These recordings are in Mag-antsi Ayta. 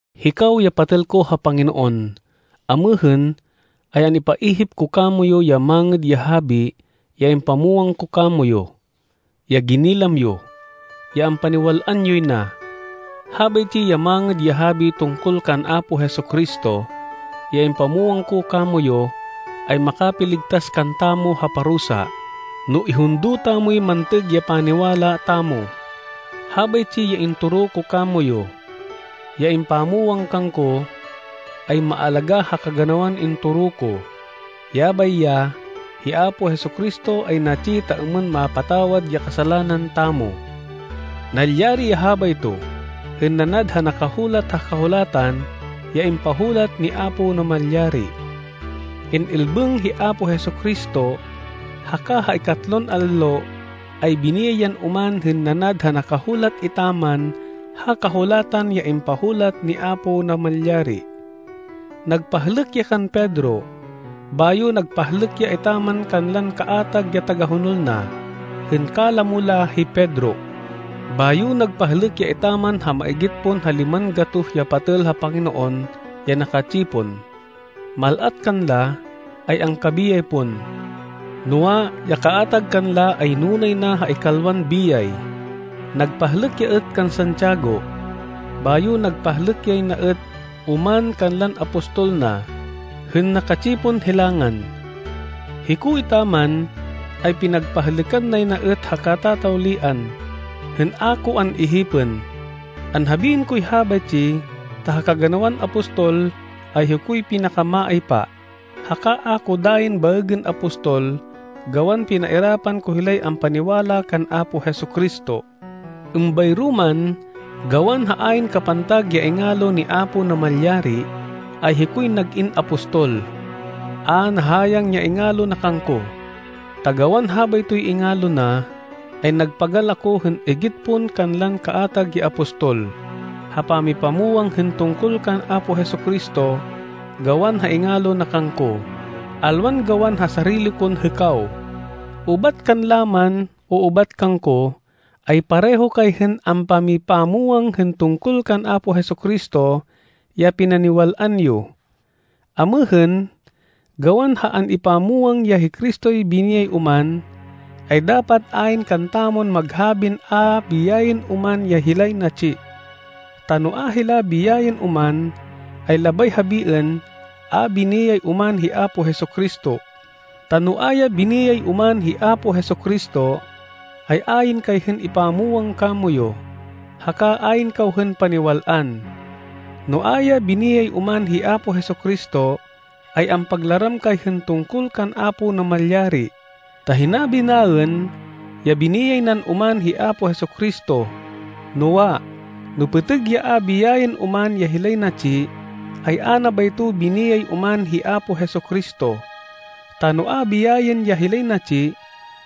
Hikaw ya patêl ko ha Panginoon, amêhên, ay an-ipaihip ko kamoyu ya Mangêd ya Habi ya impamwang ko kamoyu, ya ginilam yo, ya ampaniwal-an yoy na. Habaytsi ya Mangêd ya Habi tungkol kan Apo Jesu-Cristo, ya impamwang ko kamoyu, ay makapiligtas kantamo ha parusa, no ihundo tamoy mantêg ya paniwala tamo. Habaytsi ya intoro ko kamoyu, ya impamwang kangko, ay maalagá ha kaganawan intoro ko. Yabay ya, hi Apo Jesu-Cristo ay natsi ta êmên mapatawad ya kasalanan tamo. Nalyari ya habayto hên nanad ha nakahulat ha Kahulatan ya impahulat ni Apo Namalyari. In-ilbêng hi Apo Jesu-Cristo, haka ha ikatlon allo, ay biniyay yan oman hên nanad ha nakahulat etaman ha Kahulatan ya impahulat ni Apo Namalyari. Nagpahlêk ya kan Pedro, bayo nagpahlêk ya etaman kanlan kaatag ya tagahonol na, hên kalamo la hi Pedro. Bayo nagpahlêk ya etaman ha maigit pon ha liman gatoh ya patêl ha Panginoon ya naka-tsipon. Mal-at kanla, ay angkabiyay pon. Noa, ya kaatag kanla ay nunay na ha ikalwan biyay. Nagpahlêk ya êt kan Santiago, bayo nagpahlêk yay na êt oman kanlan apostol na, hên naka-tsipon hilangan. Hiko etaman, ay pinagpahlêkan nay na êt ha katatawlian, hên a ko an-ihipên. Anhabiên koy habaytsi ta ha kaganawan apostol, ay hikoy pinaka-maaypa, haka a ko dayin baêgên apostol gawan pinairapan ko hilay ampaniwala kan Apo Jesu-Cristo. Êmbayro man, gawan ha ayn kapantag ya ingalo ni Apo Namalyari, ay hikoy nag-in apostol. A nahayang ya ingalo na kangko. Ta gawan habaytoy ingalo na, ay nagpagal ako hên igit pon kanlan kaatag ya apostol, ha pamipamwang hên tungkol kan Apo Jesu-Cristo gawan ha ingalo na kangko, alwan gawan ha sarili kon hêkaw. Ubat kanla man o ubat kangko, ay pareho kay hên ampamipamwang hên tungkol kan Apo Jesu-Cristo ya pinaniwal-an yo. Amêhên, gawan ha an-ipamwang ya hi Cristoy biniyay oman, ay dapat ayn kantamon maghabin a biyayên oman ya hilay natsi. Ta no a hila biyayên oman, ay labay habiên, a biniyay oman hi Apo Jesu-Cristo. Ta no a ya biniyay oman hi Apo Jesu-Cristo, ay ayn kay hên ipamwang kamoyu, haka ayn kaw hên paniwal-an. No a ya biniyay oman hi Apo Jesu-Cristo, ay ampaglaram kay hên tungkol kan Apo Namalyari, ta hinabi naên ya biniyay nan oman hi Apo Jesu-Cristo. Noa, no pêtêg ya a biyayên oman ya hilay natsi, ay a na bayto biniyay oman hi Apo Jesu-Cristo. Ta no a biyayên ya hilay natsi,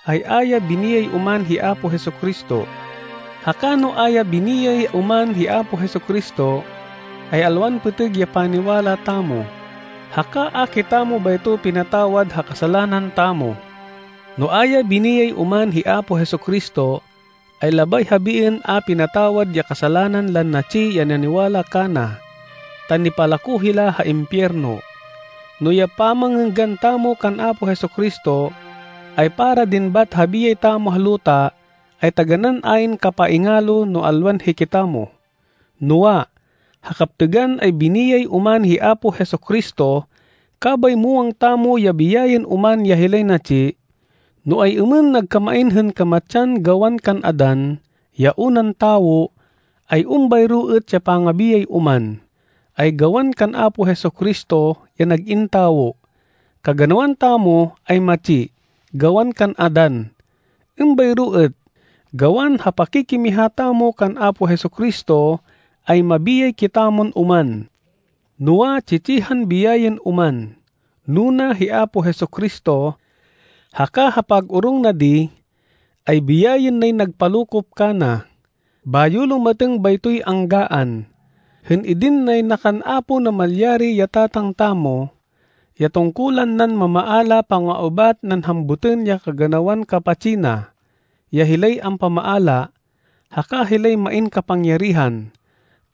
ay a ya biniyay oman hi Apo Jesu-Cristo. Haka no a ya biniyay oman hi Apo Jesu-Cristo, ay alwan pêtêg ya paniwala tamo, haka a kitamo bayto pinatawad ha kasalanan tamo. No a ya biniyay oman hi Apo Jesu-Cristo, ay labay habiên a pinatawad ya kasalanan lan natsi ya naniwala kana, ta nipalako hila ha impiyerno. No ya pamangênggan tamo kan Apo Jesu-Cristo, ay para din bat ha biyay tamo ha luta, ay taganán ayn kapaingalo no alwan hikitamo. Noa, ha kaptêgan, ay biniyay oman hi Apo Jesu-Cristo. Kabay muwang tamo ya biyayên oman ya hilay natsi. No ay-êmên nagkamain hên kamatsan gawan kan Adan, ya unan tawo, ay êmbayro êt ya pangabiyay oman, ay gawan kan Apo Jesu-Cristo, ya nag-in tawo. Kaganawan tamo ay matsi gawan kan Adan. Êmbayro êt, gawan ha pakikimiha tamo kan Apo Jesu-Cristo, ay mabiyay kitamon oman. Noa, tsi-tsihan biyayên oman. Nuna hi Apo Jesu-Cristo. Haka ha pag-orong na di, ay biyayên nay nagpalokop kana, bayo lumatêng baytoy anggaan, hên idin nay na kan Apo Namalyari ya Tatang tamo, ya tungkulan nan mamaala panga-ubat nan hambutên ya kaganawan kapatsi na, ya hilay ampamaala, haka hilay main kapangyarihan.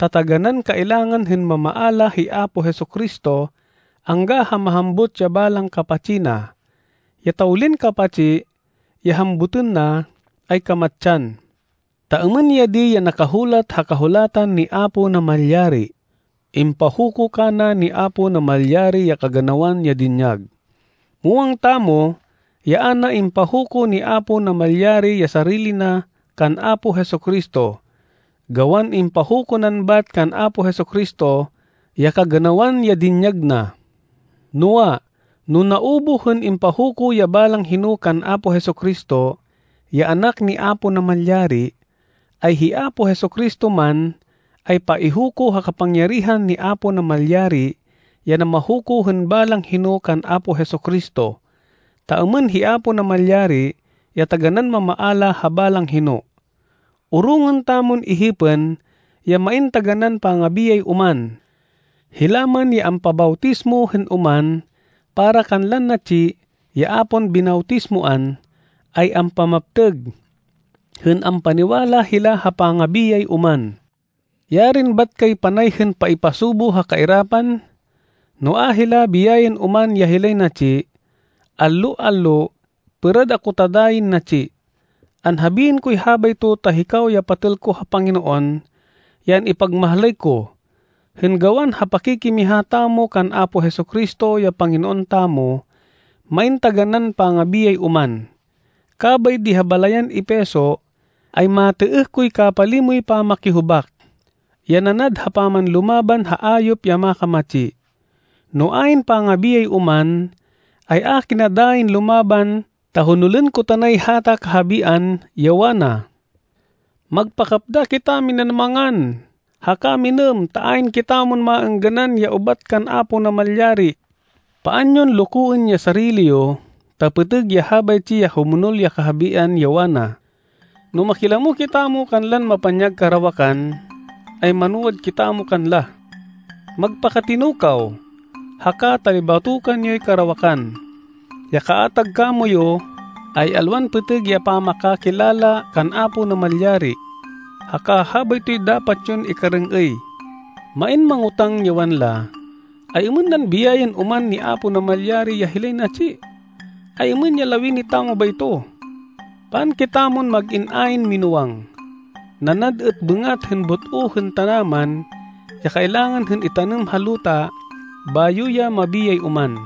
Ta taganán, kailangan hên mamaala hi Apo Jesu-Cristo angga ha mahambut ya balang kapatsi na. Ya tawlin kapatsi, ya hambutên na, ay kamatsan, ta êmên ya di ya nakahulat ha Kahulatan ni Apo Namalyari, “Impahuko kana ni Apo Namalyari ya kaganawan ya dinyag.” Muwang tamo ya a na impahuko ni Apo Namalyari ya sarili na kan Apo Jesu-Cristo, gawan impahuko nan bat kan Apo Jesu-Cristo ya kaganawan ya dinyag na. Noa, no naubuh hên impahuko ya balang hino kan Apo Jesu-Cristo, ya Anak ni Apo Namalyari, ay hi Apo Jesu-Cristo man, ay paihuko ha kapangyarihan ni Apo Namalyari ya namahuko hên balang hino kan Apo Jesu-Cristo, ta êmên hi Apo Namalyari ya taganán mamaala ha balang hino. Orongên tamon ihipên ya main taganán pangabiyay oman. Hila man ya ampabawtismo hên oman para kanlan natsi ya a pon binawtismoan, ay ampamaptêg, hên ampaniwala hila ha pangabiyay oman. Yarin bat kay panay hên paipasubo ha kairapan, no a hila biyayên oman ya hilay natsi! Allo-allo, pêrad ako ta dayin natsi. Anhabiên koy habayto ta hikaw ya patêl ko ha Panginoon, ya an-ipagmahlay ko, hên gawan ha pakikimiha tamo kan Apo Jesu-Cristo, ya Panginoon tamo. Main taganán pangabiyay oman. Kabay di ha balayan Efeso, ay matêêh koy kapalimoy pamakihubak, ya nanad ha pamanlumaban ha ayop ya makamatsi. No ayn pangabiyay oman, ay a kina dayin lumaban ta honolên ko tanay hata kahabian, ya wana, “Magpakapda kitaminan mangan, haka minêm ta ayn kitamon maêngganan ya ubat kan Apo Namalyari.” Paan yon lokoên ya sarili yo ta pêtêg ya habaytsi ya humonol ya kahabian ya wana, “No makilamo kitamo kanlan mapanyag karawakan, ay manwad kitamo kanla.” Magpakatino kaw, haka talibatokan yoy karawakan. Ya kaatag kamoyu, ay alwan pêtêg ya pamakakilala kan Apo Namalyari, haka habaytoy dapat yon ikarêng-êy. Main mangotáng ya wanla, “Ay-êmên nan biyayên oman ni Apo Namalyari ya hilay natsi? Ay-êmên ya lawini tamo bayto?” Paan kitamon mag-in ayn minúwang. Nanad êt bêngat hên but-o hên tanaman ya kailangan hên itanêm ha luta bayo ya mabiyay oman.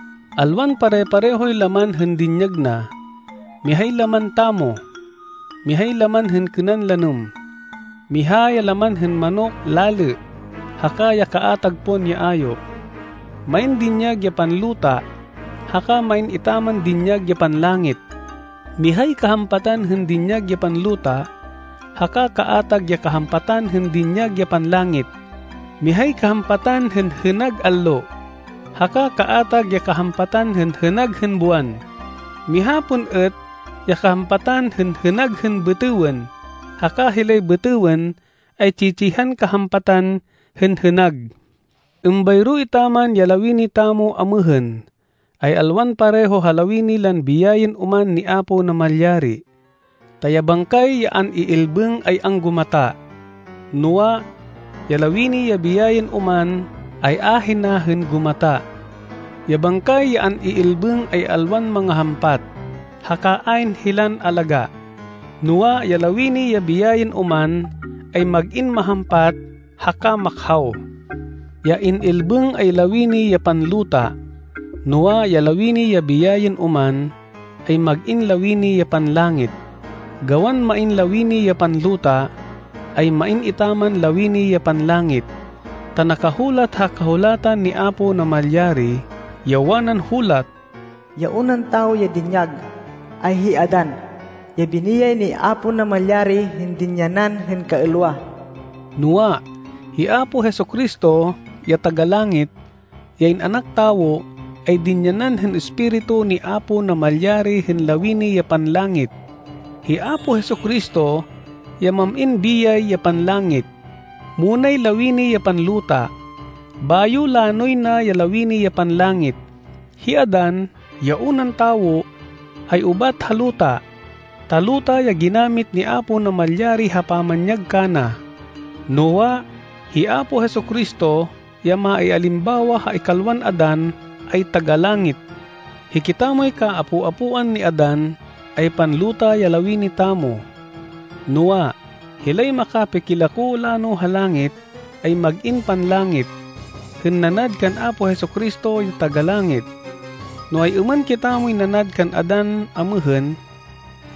Alwan pare-parehoy laman hên dinyag na. Mihay laman tamo. Mihay laman hên kênan lanêm. Miha ya laman hên manok lalê haka ya kaatag pon ya ayop. Main dinyag ya panluta haka main etaman dinyag ya panlangit. Mihay kahampatan hên dinyag ya panluta, haka kaatag ya kahampatan hên dinyag ya panlangit. Mihay kahampatan hên hênag allo, haka kaatag ya kahampatan hên hênag hên buwan. Miha pon êt ya kahampatan hên hênag hên bêtêwên. Haka hilay bêtêwên ay tsi-tsihan kahampatan hên hênag. Êmbayro etaman ya lawini tamo amêhên, ay alwan pareho ha lawini lan biyayên oman ni Apo Namalyari, ta ya bangkay ya an-iilbêng ay anggumata. Noa, ya lawini ya biyayên oman ay ahina hên gumata. Ya bangkay ya an-iilbêng ay alwan mangahampat haka ayn hilan alagá. Noa, ya lawini ya biyayên oman, ay mag-in mahampat haka makhaw. Ya in-ilbêng ay lawini ya panluta. Noa, ya lawini ya biyayên oman, ay mag-in lawini ya panlangit. Gawan main lawini ya panluta, ay main etaman lawini ya panlangit. Ta nakahulat ha Kahulatan ni Apo Namalyari, ya wanan hulat, “Ya unan tawo ya dinyag, ay hi Adan, ya biniyay ni Apo Namalyari hên dinyanan hên kaêlwa.” Noa, hi Apo Jesu-Cristo, ya Taga-Langit, ya In-anak Tawo, ay dinyanan hên Espiritu ni Apo Namalyari hên lawini ya panlangit. Hi Apo Jesu-Cristo ya mam-in biyay ya panlangit. Munay lawini ya panluta, bayo lanoy na ya lawini ya panlangit. Hi Adan, ya unan tawo, ay ubat ha luta, ta luta ya ginamit ni Apo Namalyari ha pamanyag kana. Noa, hi Apo Jesu-Cristo, ya maialimbawa ha ikalwan Adan, ay taga-langit. Hikitamoy kaapo-apoan ni Adan, ay panluta ya lawini tamo. Noa, hilay makapikilako lano ha langit, ay mag-in panlangit, hên nanad kan Apo Jesu-Cristo ya taga-langit. No ay-êmên kitamoy nanad kan Adan amêhên,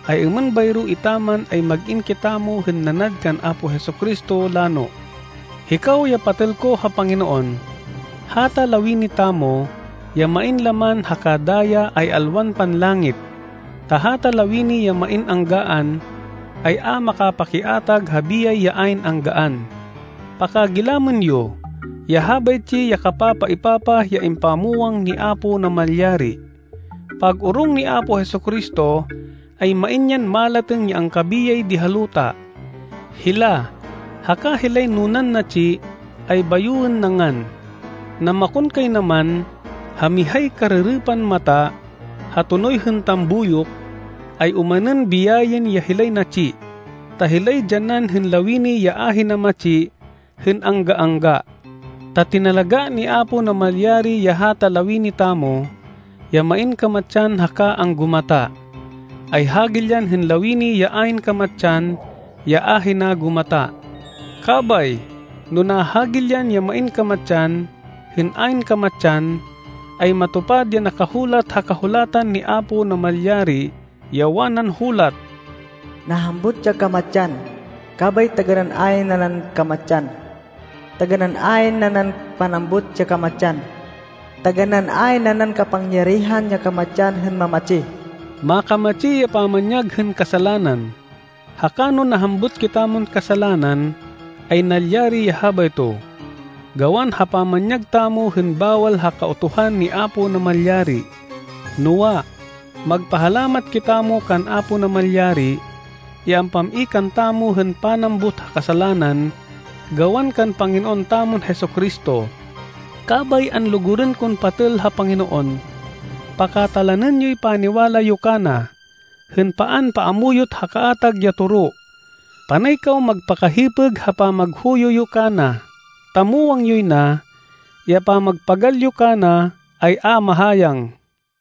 ay êmên bayro etaman ay mag-in kitamo hên nanad kan Apo Jesu-Cristo lano. Hikaw ya patêl ko ha Panginoon, hata lawini tamo, ya main laman haka daya ay alwan panlangit. Ta hata lawini ya main anggaan, ay a makapakiatag ha biyay ya ayn anggaan. Pakagilamên yo ya habaytsi ya kapapaêpapah ya impamwang ni Apo Namalyari: Pag-orong ni Apo Jesu-Cristo, ay main yan malatêng ya angkabiyay di ha luta. Hila, haka hilay nunan natsi, ay bayoên na ngan. Namakonkaynaman, ha mihay karêrêpan mata, ha tonoy hên tambuyok, ay omanên biyayên ya hilay natsi, ta hilay dyanan hên lawini ya ahina matsi hên angga-angga. Ta tinalagá ni Apo Namalyari ya hata lawini tamo, ya main kamatsan haka anggumata, ay hagilyan hên lawini ya ayn kamatsan ya ahina gumata. Kabay, no nahagilyan ya main kamatsan, hên ayn kamatsan, ay matupad ya nakahulat ha Kahulatan ni Apo Namalyari, ya wanan hulat, “Nahambut ya kamatsan kabay taganán ayn nanan kamatsan!” “Taganán ayn nanan panambut ya kamatsan! Taganán ayn nanan kapangyarihan ya kamatsan hên mamatsi!” Makamatsi ya pamanyag hên kasalanan, haka no nahambut kitamon kasalanan, ay nalyari ya habayto, gawan ha pamanyag tamo hên bawal ha Kautuhan ni Apo Namalyari. Noa, magpahalamat kitamo kan Apo Namalyari, ya ampam-i kantamo hên panambut ha kasalanan gawan kan Panginoon tamon Jesu-Cristo. Kabay, anlugurên kon patêl ha Panginoon, pakatalanên yoy paniwala yo kana, hên paan paamuyot ha kaatag ya toro. Panay kaw magpakahipêg ha pamaghuyo yo kana, ta muwang yoy na, ya pamagpagal yo kana, ay a mahayang.